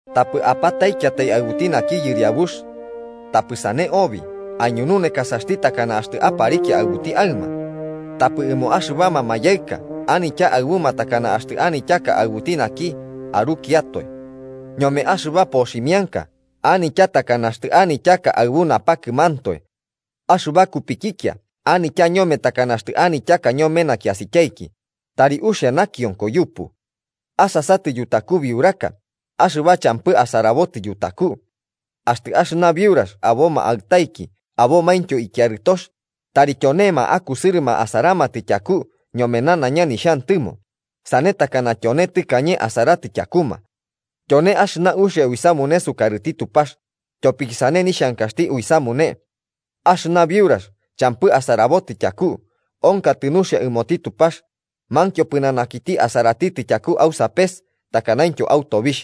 Tapɨ apataikiatai aɨbuti naki yɨriabux. Tapɨ sane obi, aiñununekasaxti takana axtɨ aparikia aɨbuti aɨma. Tapɨ ɨmo axɨbama mayaɨka anitya aɨbuma takana axtɨ anityaka aɨbuti naki arukiatoe. Ñome axɨba poximianka anitya takana axtɨ anityaka aɨbu napakɨmantoe. Axɨba kupikikia anitya ñome takana axtɨ anityaka ñome nakiasityaiki, tari uxia nakionko yupu. Asasatɨ yutaku biuraka, axɨba champɨti asarabotɨ yutaku. Axtɨ axɨna biurax aboma aɨtaiki abomaintyo ikiarɨtox, tari tyonema akusɨrɨma asaramatɨ tyaku ñome nanaiña nixhantɨmo, sane takana tyone tɨkañe asaratɨ tyakuma. Tyone axɨna uxia uisamune sukarɨti Tupax, tyopiki sane nixhankaxti uisamune. Axɨna biurax champɨti asarabotɨ tyaku, onkotɨ nuxia ɨmoti Tupax, mankio pɨnanakiti asaratitɨ tyaku au sapes takanaintyo au tobixh.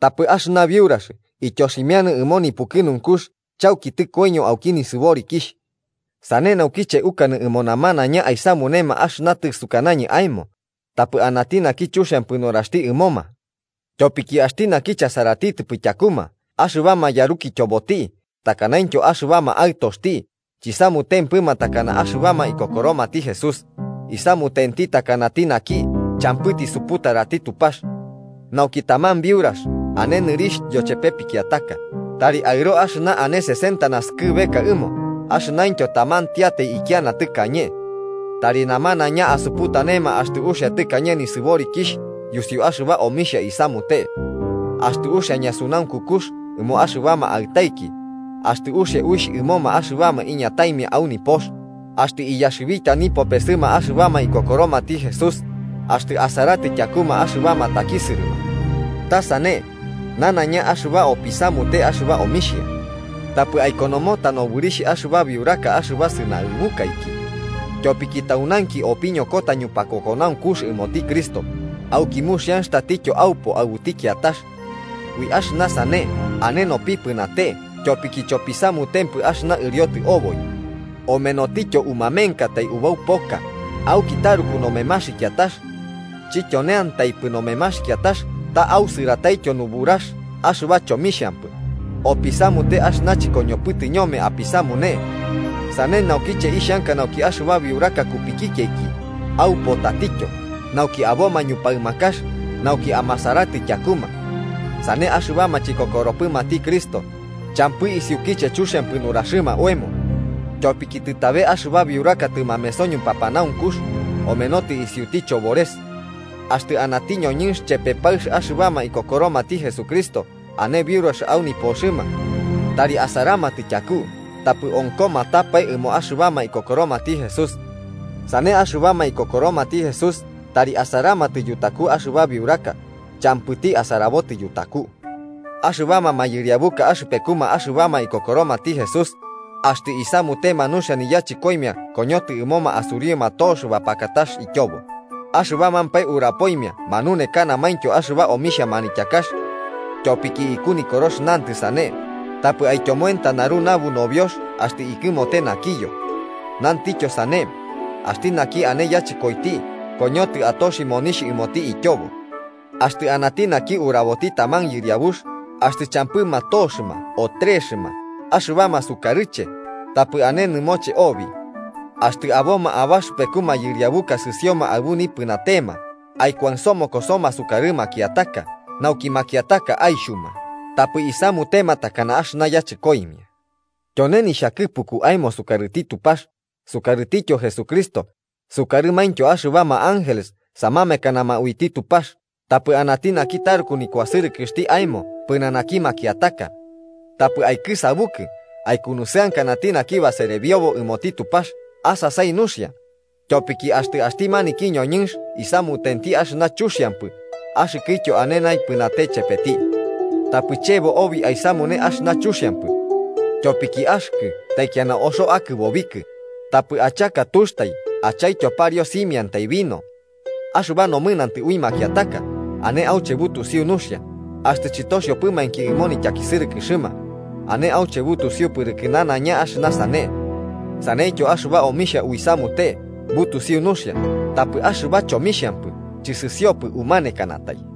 Tapɨ axɨna biurax ityoximianɨ ɨmo nipukɨnunkux chauki tɨkoiño auki nisɨborikixh. Sane naukiche ukanɨ ɨmo namanaiña aisamunema axɨna tɨsukanañɨ aemo, tapɨ anati naki chuxiampɨ nuraxti ɨmoma. Tyopiki axti naki chasaratitɨpɨ tyakuma axɨbama yarukityoboti takanaintyo axɨbama aɨtoxti chisamutentipɨ takana axɨbama ikokoromati Jesús, isamutenti takanati naki champɨ tisuputarati Tupax. Nauki taman biurax ane nɨrixh yochepe pikiataka, tari aɨro axɨna ane sesenta naskɨbeka ɨmo axɨnaintyo tamantiatai ikiana tɨkañe. Tari namanaiña asuputanema axtɨ uxia tɨkañe nisɨborikixh yusiuki axɨba omixhia isamute. Axtɨ uxia ñasunaunkukux ɨmo axɨbama aɨtaiki, axtɨ uxia uixh ɨmoma axɨbama iñataimia au nipox, axtɨ iyaxɨbita nipopesɨma axɨbama ikokoromati Jesús, axtɨ asaratɨ tyakuma axɨbama takisɨrɨma. Ta sane, nanaiña axɨba opisamute axɨba omixhia. Tapɨ aikonomota nobɨrixh axɨba biuraka axɨba sɨnaɨbukaiki. Tyopiki taunainki opiñokota ñupakokonaunkux ɨmoti Cristo, auki muxianx tatityo aupo aɨbuti kiatax. Ui axɨna sane ane nopipɨnate tyopiki chopisamutempɨ axɨna ɨriotɨ oboi. Omenotityo umamenkatai ubau poka, auki taruku nomemaxikiatax. Chityoneantaipɨ nomemaxikiatax, ta ausɨrataityo nuburax axɨba chomixhampɨ, opisamute axɨna chɨkoñopɨtɨ ñome apisamune. Sane naukiche ixhanka nauki axɨba biuraka kupikikiaiki, aupo tatityo, nauki aboma ñupaɨmakax, nauki amasaratɨ tyakuma. Sane axɨbama chikokoropɨmati Cristo champɨ isiukiche chuxiampɨ nuraxɨma oemo. Tyopiki tɨtabe axɨba biuraka tɨmameso ñupapanaunkux, omenotɨ isiuti chobores. Axtɨ anati ñoñɨnx chepe paɨx axɨbama ikokoromati Jesucristo ane biurax au nipoxɨma, tari asaramatɨ tyaku tapɨ onkomatapae ɨmo axɨbama ikokoromati Jesús. Sane axɨbama ikokoromati Jesús tari asaramatɨ yutaku axɨba biuraka champɨti asarabotɨ yutaku. Axɨbama mayɨriabuka axɨpekuma axɨbama ikokoromati Jesús axtɨ isamutema nuxia niyachɨkoimia koñotɨ ɨmoma asuriuma tox bapakakax ityobo, axɨbamampae urapoimia manunekanamaintyo axɨba omixhia manityakax. Tyopiki iku Nikorox nantɨ sane: “Tapɨ aityomoenta naru nabu nobiox axtɨ ikɨmote nakiyo” Nantityo sane: “Axti naki ane yachɨkoiti koñotɨ atoxi ɨmoti monixh ityobo.” Axtɨ anati naki uraboti taman yɨriabux, axtɨ champɨma toxɨma o trexɨma, axɨbama sukarɨche tapɨ ane nɨmoche obi. Axtɨ aboma abaxɨpeku mayɨriabuka sɨsioma aɨbu nipɨnatema, aikuansomokosoma sukarɨ makiataka, nauki makiataka aixhuma tapɨ isamutema takana axɨna yachɨkoimia. Tyone nixhakɨpuku aemo sukarɨti Tupax, sukarɨtityo Jesucristo, sukarɨmaintyo axɨbama ángeles samamekanama uiti Tupax tapɨ anati naki taruku nikuasɨrɨkɨxti aemo pɨnanaki makiataka. Tapɨ aikɨsabukɨ aikunusɨankanati naki baserebiobo ɨmoti Tupax asasai nuxia, tyopiki axtɨ axti maniki ñoñɨnx isamutenti axɨna chuxiampɨ axɨkɨtyo ane naipɨnate chepeti. Tapɨ chebo obi aisamune axɨna chuxiampɨ. Tyopiki axɨkɨ taikiana oxo akɨbobikɨ, tapɨ achaka tuxtai, achaityo pariu simiantai vino. Axɨba nomɨnantɨ ui makiataka ane auche butusiu nuxia axtɨ chɨtoxiopɨmainki ɨmo nityakisɨrɨkɨxɨma, ane auche butusiu pɨrɨkɨ nanaiña axɨna sane. Saneityo axɨba omixhia uisamute, butusiu nuxia, tapɨ axɨba chomixhampɨ chɨsɨsiopɨ umanekanatai.